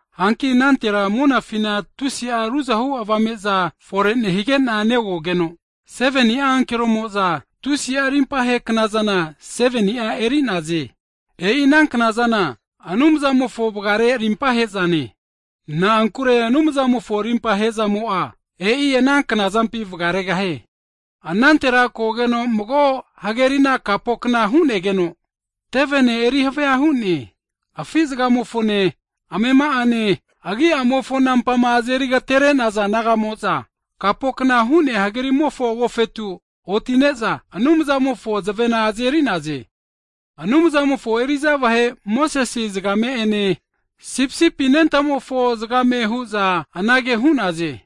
Hanki anantera monafina tusi'a ruzahu avame'za fore nehige'na negogeno, 7ni'a ankeromo'za, tusi'a rimpahe knazana 7ni'a eri'naze. E'ina knazana Anumzamofo vgare rimpa he'zane. Na'ankure Anumzamofo rimpa hezamo'a, e'i ana knazampi vgaregahie. Anantera kogeno mago hagerina kapokna hu'negeno, tevene eri havia hu'ne. Afi zgamofone, amema'ane, agi'amofo nampama azeri agaterenaza nagamo'za, kapokna hu'nea hagerimofo agofetu oti'ne'za, Anumzamofo zavena (harps) azeri'naze. Anumzamofo eri'za vahe Mosese zgame'ene Sipisipi Anentamofo zgame hu'za anage hu'naze,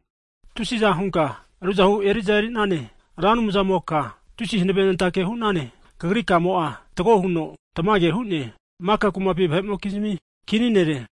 Tusiza hunka ruzahu eriza eri'nane, Ra Anumzamoka tusi hanavenentake hu'nane, Kagri kamo'a fatgo huno tamage hu'ne, maka kumapi vahe'mokizmi kini Nere!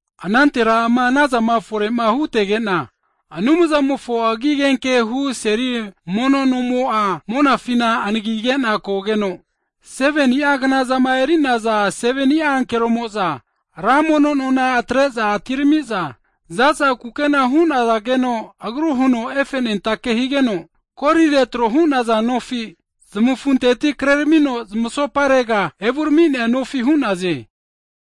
Anantera ama anazama fore'ma hutegena, Anumzamofo agi agenkehu seli mono nomo'a monafina anaginegena kogeno, 7ni'a knazama eri'naza, 7ni'a ankeromo'za, ra mono nona atre'za atiramiza, zaza kukena (linen) hunazageno agru huno efenentake higeno, kolire tro hu'naza nofi zmafunteti kreramino zmasoparega evuraminea nofi hu'naze.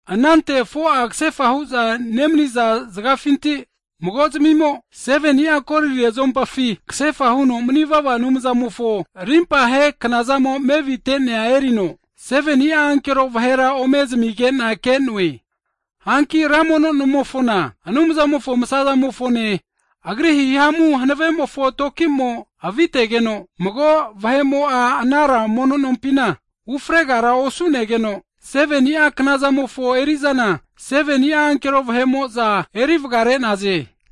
Anante 4'a kasefa hu'za nemaniza zgafinti mago zmimo, 7ni'a kolire zuompafi kasefa huno manivava Anumzamofo rimpahe knazamo mevite'nea erino, 7ni'a ankero vahera ome zamigena ke'noe. Hanki ra mono nomofona, Anumzamofo msa'zamofone, Agri hihamu hanavemofo tokimo avitegeno, mago vahe'mo'a, ana ra mono nompina ufregara osunegeno, 7ni'a knazamofo erizana, 7ni'a ankero vahe'mo'za eri vgare'naze.